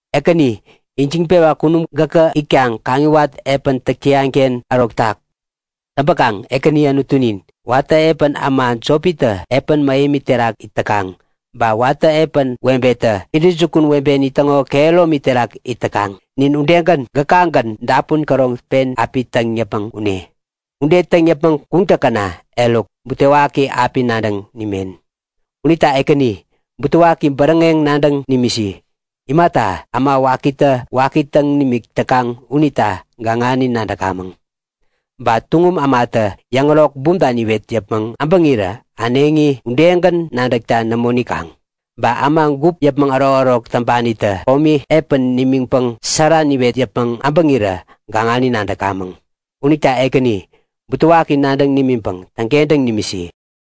Ekäni, ijiŋpewa kunum gäkä itkaŋ kaŋiwat epän täk täyanken ärotak. Täŋpäkaŋ Ekäni Anutunin, watä epän äma jopitä epän mähemi terak it täkaŋ, ba watä epän webetä intäjukun webeni täŋo kehäromi terak it täkaŋ, nin udegän gäkagän dapun käroŋ pen api täŋ yäpmäŋ kune. Ude täŋ yäpmäŋ kuŋtäkäna, eruk butewaki api nadäŋ nimen. Unita Ekäni, butewaki bäräŋeŋ nadäŋ nimisi. Imata, äma wakitä waki täŋ nimik täkaŋ unita gaŋani nadäkamäŋ. Ba tuŋum ämatä yäŋärok bumta niwet yäpmäŋ äbäŋirä äneŋi udegän nadäkta nämo nikaŋ. Ba äma gup yäpmäŋ ärokärok täŋpanitä komi epän nimiŋpäŋ sära niwet yäpmäŋ äbäŋirä gaŋani nadäkamäŋ. Unita Ekäni, butewaki nadäŋ nimiŋpäŋ täŋkentäŋ nimisi.